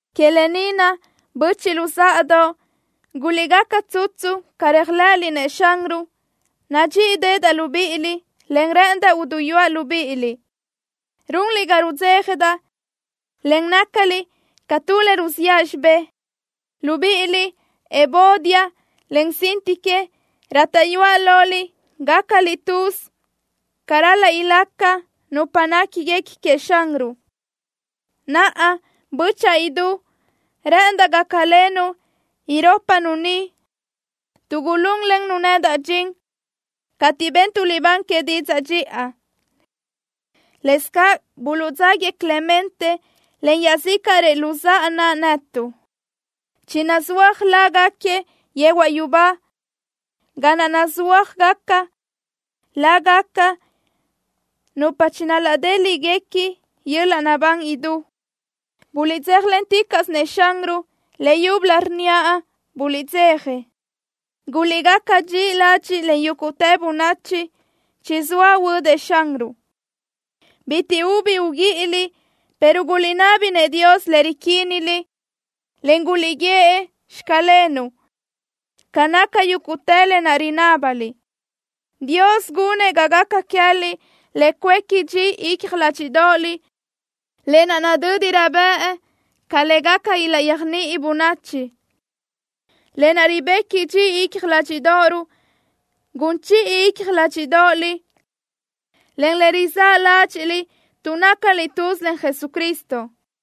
Que lë ni naʼ, böchiʼ luzáʼadoʼ, guliʼgaca tsutsu ca réajlëʼëliʼ-nëʼ Xanruʼ. Nadxíʼideʼedaʼ libíʼiliʼ, en rë́ʼëndaʼ uduyúaʼ libíʼiliʼ. Runliʼ ga rudzéjadaʼ, en nácaliʼ ca tu le ruziʼa xibé. Libíʼiliʼ, Evodia, en Síntique, rátaʼyuaʼ loliʼ gácaliʼ tuz ca ral-laʼ ilaca nupa néquiguequi queëʼ Xanruʼ. Naʼa, bö́chaʼa idú, rë́ʼëndaʼ gácalenuʼ irópanu ni, tuʼ gulúnlennu nedaʼ dxin, cateʼ bentuʼ libán que didzaʼ dxiʼa. Lëscaʼ buluʼdzáguiëʼ Clemente, en iaʼzícaʼrëʼ luzáʼa naʼ netuʼ. Chinazúajgaca lágaquiëʼ yehuaʼ yubá ga naʼ nazúajgaca lágaca nupa chinadéliʼgaca yöl-laʼ naʼbán idú. ¡Buliʼdzéjalenticaʼsö-nëʼ Xanruʼ! Leyúbölö, rnníaʼ: ¡Buliʼdzeja! ¡Guliʼgaca dxiʼi ladxiʼ len yúguʼtë bönachi! ¡Chizóa huödëʼ Xanruʼ! Bitiʼ ubi uguíʼiliʼ, pero guliʼnabi-nëʼ Dios le riquíniliʼ, en guliʼguíëʼ: “Xclenuʼ” ca naca yúguʼtë lë naʼ rinábaliʼ. Dios gunëʼ ga gaca queë́liʼ le cuéqui dxi icja ládxiʼdoʼoliʼ, lë naʼ nadö́dirö bëʼ ca le gaca ilaʼyéajniʼi bönachi. Lë naʼ ribequi dxi icja ládxiʼdoʼoruʼ gun chiʼi icja ládxiʼdoʼoliʼ, en le rizáʼ ládxiʼliʼ tuʼ nácaliʼ tuz len Jesucristo.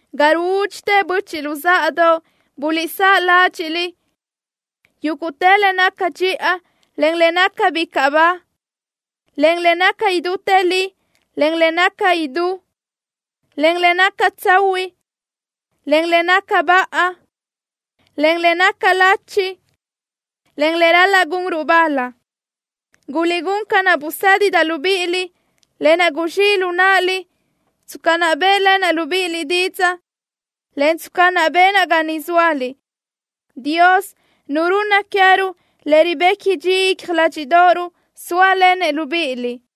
Ga ruúdxitë, böchiʼ luzáʼadoʼ, guliʼsáʼ ládxiʼliʼ: Yúguʼtë le naca dxiʼa, en le naca bicaʼ ba, en le naca idútë li, en le naca idú, en le naca tsahuiʼ, en le naca baʼa, en le naca lachi, en le ral-laʼ gunruʼ bal. Guliʼgún ca naʼ busédidaʼ libíʼiliʼ, lë naʼ guzxíʼ lu náʼaliʼ tsca naʼ bë́ʼlenaʼ libíʼiliʼ didzaʼ, en tsca naʼ benaʼ ga niʼ zóaliʼ. Dios, Nu runna queë́ruʼ le ribequi dxi icja ládxiʼdoʼoruʼ sóalenëʼ libíʼiliʼ.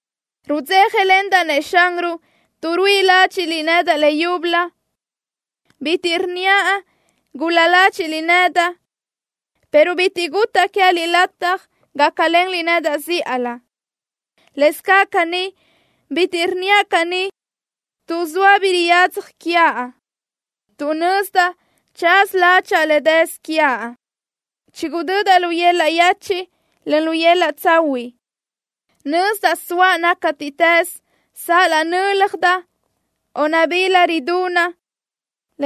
Rudzéjalendaʼ-nëʼ Xanruʼ tuʼ ruíʼi ládxiʼliʼ nedaʼ leyúbölö. Bitiʼ rnníaʼ gul-la ládxiʼliʼ nedaʼ, pero bitiʼ gutaʼ queë́liʼ lataj gácalenliʼ nedaʼ zíʼalö. Lëscaʼ caní, bitiʼ rnníaʼ caní tuʼ zoa bi riyadzaj quiaʼ, tuʼ nazëdaʼ tsaza ládxaʼa le dësö quiaʼ. Chigudödaʼ lu yöl-laʼ yechiʼ, en lu yöl-laʼ tsahuiʼ. Nazëdaʼ soaʼ nácatiʼtës, sal-laʼ nö́ljadaʼ o nabila ridunaʼ,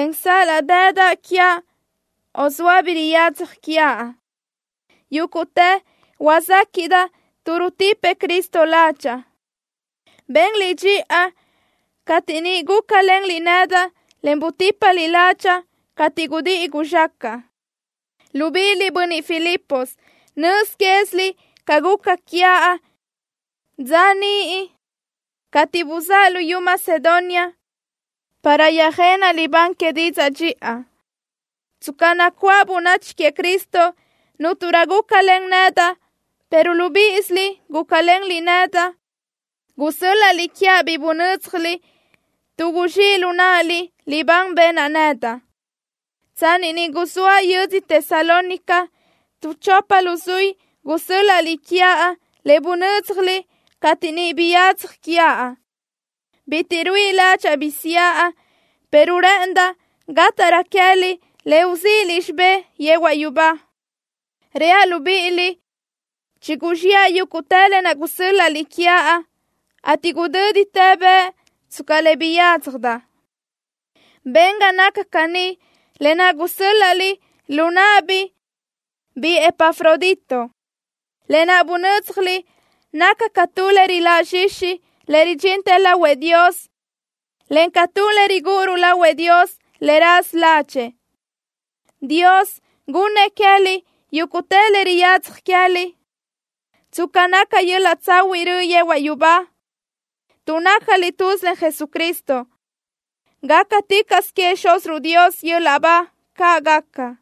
en sal-laʼ dëdaʼ quiaʼ o zoa bi riyadzaj quiaʼ. Yúguʼtë huazéquiʼdaʼ tuʼ rutipëʼ Cristo ládxaʼa. Benliʼ dxiʼa cateʼ niʼ gúcalenliʼ nedaʼ, en butípaliʼ ládxaʼa cateʼ gudíʼi guzxácaʼa. Libíʼiliʼ, bönniʼ Filipos, nöz quéziliʼ ca guca quiaʼ dza niʼ cateʼ buzáʼa luyú Macedonia, para yöjenaʼ libán que didzaʼ dxiʼa. Tsca nacuáʼ bönachi queëʼ Cristo, cúnturö nu gúcalen nedaʼ, pero libíʼisiliʼ gúcalenliʼ nedaʼ. Gusö́l-laʼliʼ quiaʼ bi bunö́dzjaliʼ, tuʼ guzxíʼ lu náʼaliʼ libán benaʼ nedaʼ. Tsanni niʼ guzóaʼ yödzö Tesalónica, tu chopa luzuí gusö́l-laʼliʼ quiaʼ le bunö́dzjaliʼ cateʼ niʼ biyadzaj quiaʼ. Bitiʼ ruíʼi ládxaʼa bi siʼa, pero rë́ʼëndaʼ gátaʼrö queë́liʼ le uzíʼiliʼ xibé yehuaʼ yubá. Reaʼ libíʼiliʼ: Chiguzxiʼa yúguʼtë lë naʼ gusö́l-laʼliʼ quiaʼ, ateʼ gudö́ditë bëʼ tsca le biyádzjadaʼ. Ben ga naca caní lë naʼ gusö́l-laʼliʼ lu náʼabiʼ biʼi Epafrodito. Lë naʼ bunö́dzjaliʼ naca ca tu le riláʼ zxixi le ridxintë lahuëʼ Dios, en ca tu le rigúʼuruʼ lahuëʼ Dios le raza ládxëʼë. Dios gunnëʼ queë́liʼ yúguʼtë le riyadzaj queë́liʼ, tsca naca yöl-laʼ tsahuiʼ röʼö yehuaʼ yubá, tuʼ nácaliʼ tuz len Jesucristo. ¡Gácaticaʼsö queëʼ Xúziruʼ Dios yöl-laʼ ba! ¡Caʼ gaca!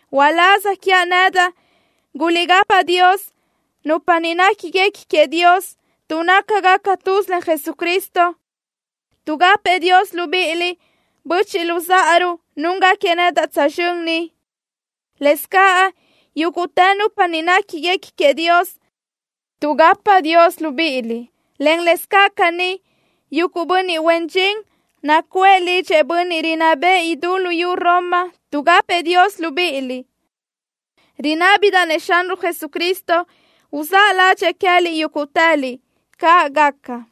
Uláz quiaʼ nedaʼ, guliʼgapa Dios nupa niʼ néquiguequi queëʼ Dios tuʼ nácagaca tuz len Jesucristo. Tuʼgapëʼ Dios libíʼiliʼ böchiʼ luzáʼaruʼ núngaquiëʼ nedaʼ tsözxö́n ni. Lëscaʼ yúguʼtë nupa ni néquiguequi queëʼ Dios, tuʼgapa Dios libíʼiliʼ, en lëscaʼ caní, yuguʼ bönniʼ huen dxin nacuʼë lidxëʼ bönniʼ rinná bëʼë idú luyú Roma tuʼgapëʼ Dios libíʼiliʼ. Rinábidaʼ-nëʼ Xanruʼ Jesucristo uzáʼ ládxëʼë queë́liʼ yúguʼtëliʼ. ¡Caʼ gaca!